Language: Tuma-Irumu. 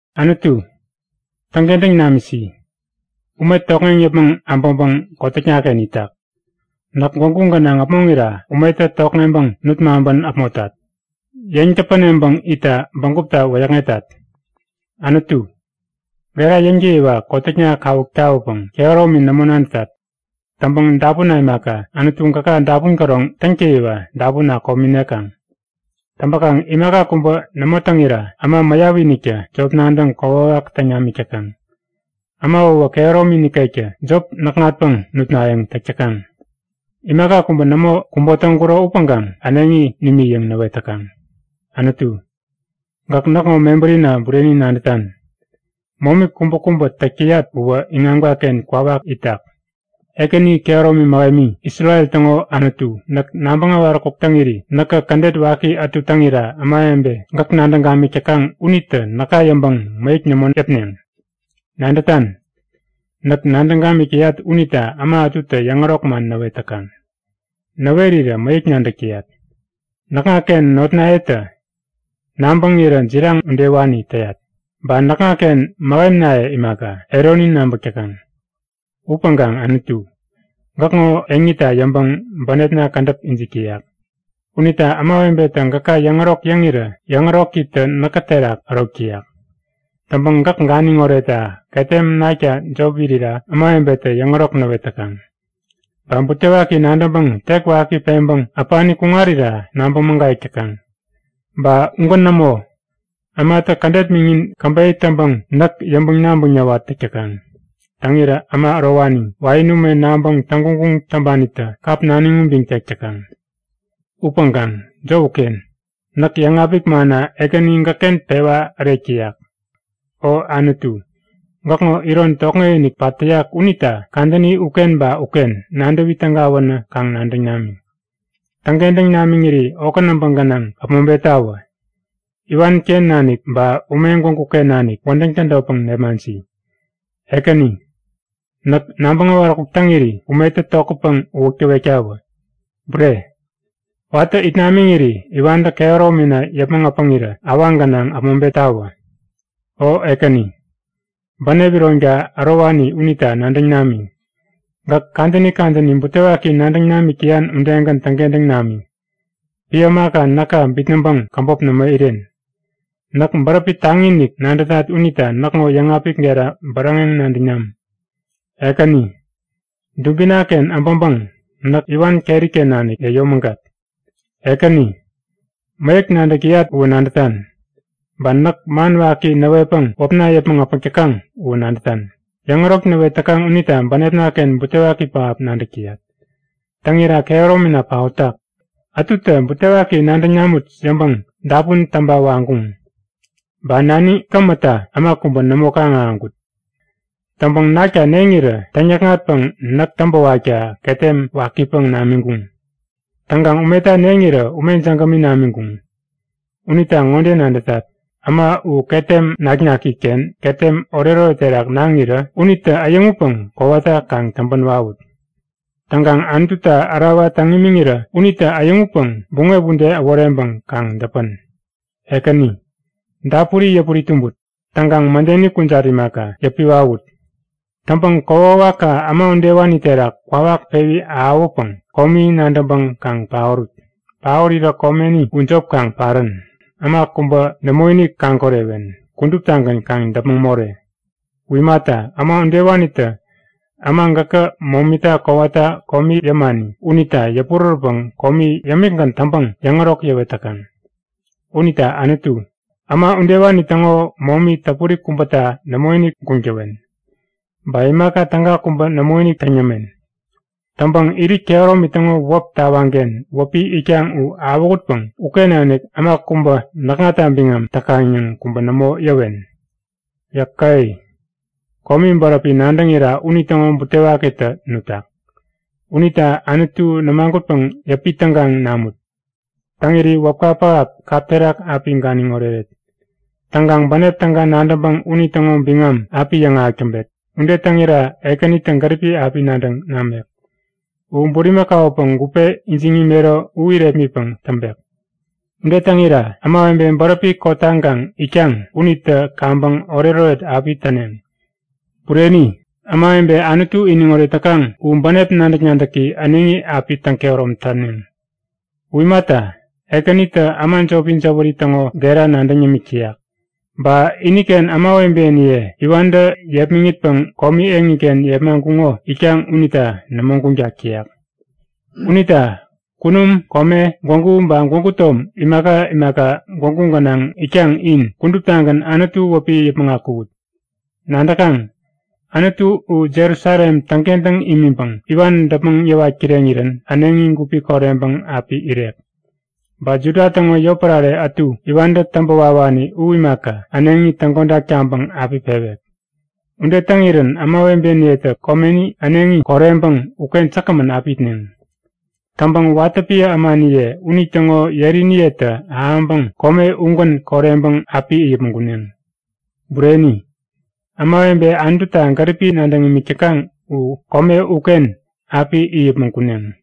Anutu, täŋkentäŋ namisi! Ume tokŋeŋ yäpmäŋ abäŋpäŋ kotäknaken itak. Näk gwägu gänaŋ äpmoŋira umetä tokŋeŋpäŋ nut maŋpän äpmotat. Yeŋ-täpäneŋpäŋ itta bägupta wäyäkŋetat. Anutu, gera yäŋtäyiwa kotäkna kawuk tawäpäŋ kehäromi nämo nadätat. Täŋpäŋ dapunna imaka, Anutu gäka dapun käroŋ täŋtäyiwa dapunna komi nekaŋ. Täŋpäkaŋ imaka kubä nämo täŋira, äma mäyapiniktä jop nadäŋ kokwawak täŋ namik täkaŋ. Äma uwä kehäromi nikektä jop näkŋatpäŋ nutnayäŋ täk täkaŋ. Imaka kubä nämo kubo täŋkuro upäŋkaŋ äneŋi nimi yäŋ näwet täkaŋ. Anutu, gäk näkŋo mebärina bureni nadätan. Momi kubäkubä täk täyat uwä iŋamkaken kwawak itak. Ekäni kehäromi mähemi, Isrel täŋo Anutu, näk nabäŋ äwaräkuk täŋiri näkä kädet waki ätu täŋira ämawebe gäk nadäŋ gamik täkaŋ unitä näka yäŋpäŋ mäyäk nämo yäpneŋ. Nadätan? Näk nadäŋ gamik täyat unita äma ätutä yäŋärok man näwet täkaŋ. Näwerirä mäyäk nadäk täyat. Näkŋaken notnayetä nabäŋirä jiraŋ udewani täyat. Ba näkŋaken mähemnaye imaka, eroni nabäk täkaŋ. Upäŋkaŋ Anutu, gäkŋo eŋita yäŋpäŋ bänepna kädäp ijik täyak. Unita ämawebetä gäka yäŋärok yäŋirä yäŋärokitä näkä terak ärok täyak. Täŋpäŋ gäk ganiŋ oretta ketem nakta jop irira ämawebetä yäŋärok näwet täkaŋ. Ba butewaki nadäŋpäŋ tek waki peŋpäŋ äpani kuŋarira nabäŋ mägayäk täkaŋ. Ba ugän nämo, ämatä kädet miŋin käbeyä täŋpäŋ näk yäŋpäŋ-nabäŋ näwat täk täkaŋ. Täŋirä äma ärowani, wain ume naŋpäŋ täŋguŋguŋ täŋpanitä kap naniŋ ubiŋ tek täkaŋ. Upäŋkaŋ jop uken! Näk yäŋapik manna Ekäni gäkken pewa ärek täyak. O Anutu, gäkŋo iron tokŋekinik pat täyak unita kadäni uken ba uken nadäwi tägawänä kaŋ nadäŋ nami! Täŋkentäŋ namiŋiri okä näbä gänaŋ äpmoŋpettawä. Iwanken nanik ba ume gwäguken nanik wädäŋ tädotpäŋ nepmaŋsi! Ekäni, näk nabäŋ äwaräkuk täŋiri umetä tokätpäŋ uwäk täwektawä. Bureni, watä it namiŋiri iwantä kehäromina yäpmäŋ äpäŋirä awaŋ gänaŋ äpmoŋpettawä. O Ekäni, bänep ironka ärowani unita nadäŋ nami. Gäk kadäni kadäni butewaki nadäŋ namik täyan udegän täŋkentäŋ nami. Piä ämaka näka bitnäŋpäŋ käbop nämo iren. Näk bäräpi taŋi-inik nadätat unita näkŋo yäŋapik gera bäräŋeŋ nadäŋ nam! Ekäni, dubinaken äbäŋpäŋ näk iwan keriken nanik yäyomägat! Ekäni, mäyäk nadäk täyat uwä nadätan, ba näk man waki näwetpäŋ wäpna yäpmäŋ äpäk täkaŋ uwä nadätan. Yäŋärok näwet täkaŋ unita bänepnaken butewaki pähap nadäk täyat. Täŋira kehäromina paotak. Ätutä butewaki nadäŋ namut yäŋpäŋ dapun täŋpa waŋkuŋ. Ba naniŋ kämätta äma kubä nämo kaŋ-ahäŋkut. Täŋpäŋ nakta neŋirä täŋ-näkŋatpäŋ näk täŋpäwakta ketem wakipäŋ namiŋkuŋ. Täŋkaŋ umeta neŋirä ume jägämi namiŋkuŋ. Unita ŋode nadätat; Äma u ketem nak-nakiken ketem oretoret terak naŋirä unitä äyäŋutpäŋ kowata kaŋ täŋpä wawut! Täŋkaŋ Anututa ärawa täŋ imiŋirä unitä äyäŋutpäŋ buŋep ude äworeŋpäŋ kaŋ däpän! Ekäni, dapuri yäpuri-tumbut. Täŋkaŋ mädeni kujat imaka, yäpi wawut! Täŋpäŋ kokwawakka äma udewani terak kwawak pewi ahäwäpäŋ komi nadäŋpäŋ kaŋ paorut! Paorirä komeni u jop kaŋ parän! Äma kubä nämoinik kaŋ-korewen, kuduptagän kaŋ däpmäŋ more! U imata, äma udewanitä äma gäkä momita kowata komi yämani unita yäpurärätpäŋ komi yämikgän täŋpäŋ yäŋärok yäwet täkaŋ. Unita Anutu, äma udewani täŋo momi täpuri kubäta nämoinik guŋ täwen. Ba imaka täga kubä nämoinik täŋ yämen. Täŋpäŋ irit kehäromi täŋo wäp tawaŋken wäpi itkaŋ u awähutpäŋ uken nanik äma kubä näkŋata biŋam täkaŋ yäŋ kubä nämo yäwen. Yäke! Komi bäräpi nadäŋira unitäŋo butewakitä nutak. Unita Anutu nämagutpäŋ yäpi-tägaŋ namut! Täŋiri wäpka pähap kap terak api ganiŋ oreret. Täŋkaŋ bänep täga nadäŋpäŋ unitäŋo biŋam api yäŋahäk täŋpet. Ude täŋira Ekänitä gäripi api nadäŋ namek. U bulimakaupäŋ gupe ijiŋ imero u irepmitpäŋ täŋpek. Ude täŋira ämawebe bäräpi kotaŋkaŋ itkaŋ unitä kaŋpäŋ oretoret api täneŋ. Bureni, ämawebe Anutu iniŋoret täkaŋ u bänep nadäk-nadäki äneŋi api täŋ-kehärom täneŋ. U imata, Ekänitä äma jopi jäwäri täŋo gera nadäŋ yämik täyak. Ba iniken ämawebeniye iwantä yepmäŋitpäŋ komi eŋiken yepmaŋkuŋo itkaŋ unita nämo guŋtak täyak. Unita kunum, kome, gwägu ba gwägu tom imaka imaka gwägu gänaŋ itkaŋ in kuduptagän Anutu wäpi yäpmäŋ akuwut! Nadäkaŋ? Anutu u Jerusalem täŋkentäŋ imiŋpäŋ iwan däpmäŋ yäwat kireŋirän äneŋi gupi koreŋpäŋ api irek. Ba Juda täŋo yotpärare ätu iwantä täŋpä wawani u imaka, äneŋi täŋkodak taŋpäŋ api pewek. Ude täŋirän ämawebeniyetä komeni äneŋi koreŋpäŋ uken säkgämän api itneŋ. Täŋpäŋ watä piä ämaniye unitäŋo yeriniyetä ahäŋpäŋ kome ugän koreŋpäŋ api it yäpmäŋ kuneŋ. Bureni, ämawebe Anututa gäripi nadäŋ imik täkaŋ u kome uken api it yäpmäŋ kuneŋ.